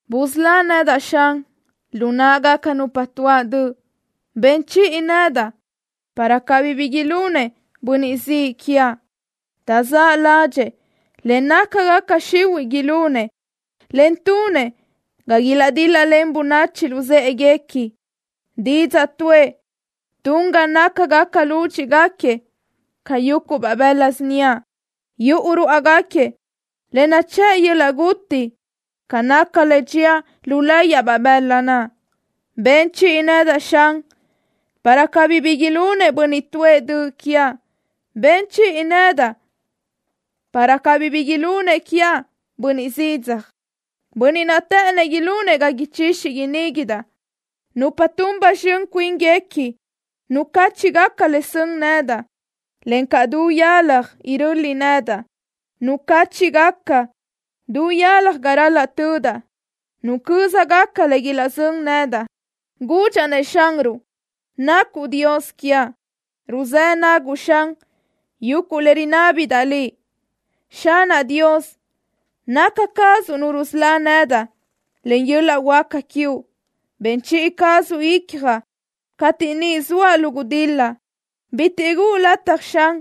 Busölá nedaʼ, Xan, lu náʼagaca nupa tuáʼ döʼ. Ben chiʼi nedaʼ para cabí bi ilunëʼ bönniʼ ziʼ quiaʼ. Taʼzáʼ ládxëʼë le nácagaca xihuiʼ ilunëʼ, en tunëʼ ga ilaʼdíl-lalen bönachi luzë́ʼeguequi. Didzaʼ tuʼë tun ga nácagaca lúdxiʼgaquiëʼ ca yuguʼ bëla síniaʼ. Yuʼu ruáʼagaquiëʼ le nachë́ʼ yöl-laʼ guti ca le dxía lu láyiʼbaʼ bëla naʼ. Ben chiʼi nedaʼ, Xan, para cabí bi ilunëʼ bönniʼ tuʼë döʼ quiaʼ. Ben chiʼi nedaʼ para cabí bi ilunëʼ bönniʼ zidzaj quiaʼ, bönniʼ naʼ të́ʼënëʼ ilunëʼ ga ichixi iníguidaʼ. Nupa tun ba zxön cuínguequi nucáchiʼgaca le sön nedaʼ, encaʼ du yalaj iröli nedaʼ. Nucáchiʼgaca du yalaj ga ral-laʼ tödaʼ. Nucö́zagaca le ilaʼzö́n nedaʼ. Gudxaʼ-nëʼ Xanruʼ: “Nacuʼ Dios quiaʼ. Ruzë́ naguʼ, Xan, yuguʼ le rinábidaʼ Liʼ. Xanaʼ Dios, naca cazuʼ Nu rusölá nedaʼ len yöl-laʼ huáca quiuʼ. Ben chiʼi cazuʼ icjaʼ cateʼ niʼ zoaʼ lu gudil-la. Bitiʼ guʼu lataj, Xan,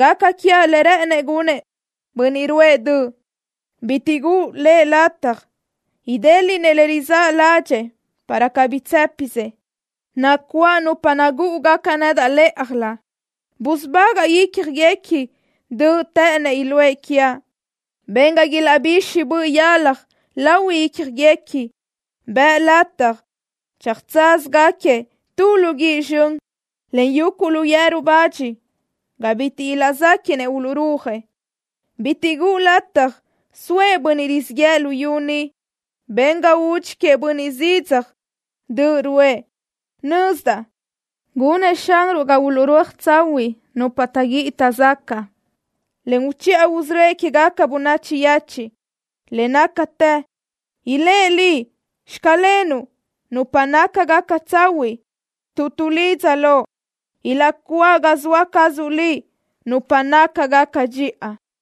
gaca quiaʼ le rë́ʼënëʼ gunëʼ bönniʼ ruʼë döʼ. Bitiʼ guʼu lëʼ lataj idéliʼnëʼ le rizáʼ ládxëʼë, para cabí tsë́pisëʼ. Nacuáʼ nupa nagúʼugaca nedaʼ lë́ʼajlö. Busubagaʼ ícjagaquiëʼ döʼ të́ʼënëʼ iluʼë quiaʼ. Ben ga ilaʼbixaj boʼ yalaj lahui ícjagaquiëʼ. Bëʼ lataj tsöjtsázagaquiëʼ tu lu guíʼ zxön, en yuguʼ lu yeru zila ga bitiʼ ilaʼzéquiʼnëʼ uluʼrúajëʼ. Bitiʼ guʼu lataj soëʼ bönniʼ rizíʼ yëʼë luyú ni. Ben ga udxín queëʼ bönniʼ zidzaj döʼ ruʼë.” Nözdaʼ gunëʼ Xanruʼ ga uluʼrúaj tsahuiʼ nupa taʼguíʼi taʼzacaʼ, en uchiʼa usörö́ëʼ quégaca bönachi yechiʼ. Le nácatë ilë́ Liʼ: “Xclenuʼ” nupa nácagaca tsahuiʼ tuʼ tuʼlidza Loʼ. Ilaʼcuáʼ ga zoa cazuʼ Liʼ nupa nácagaca dxiʼa.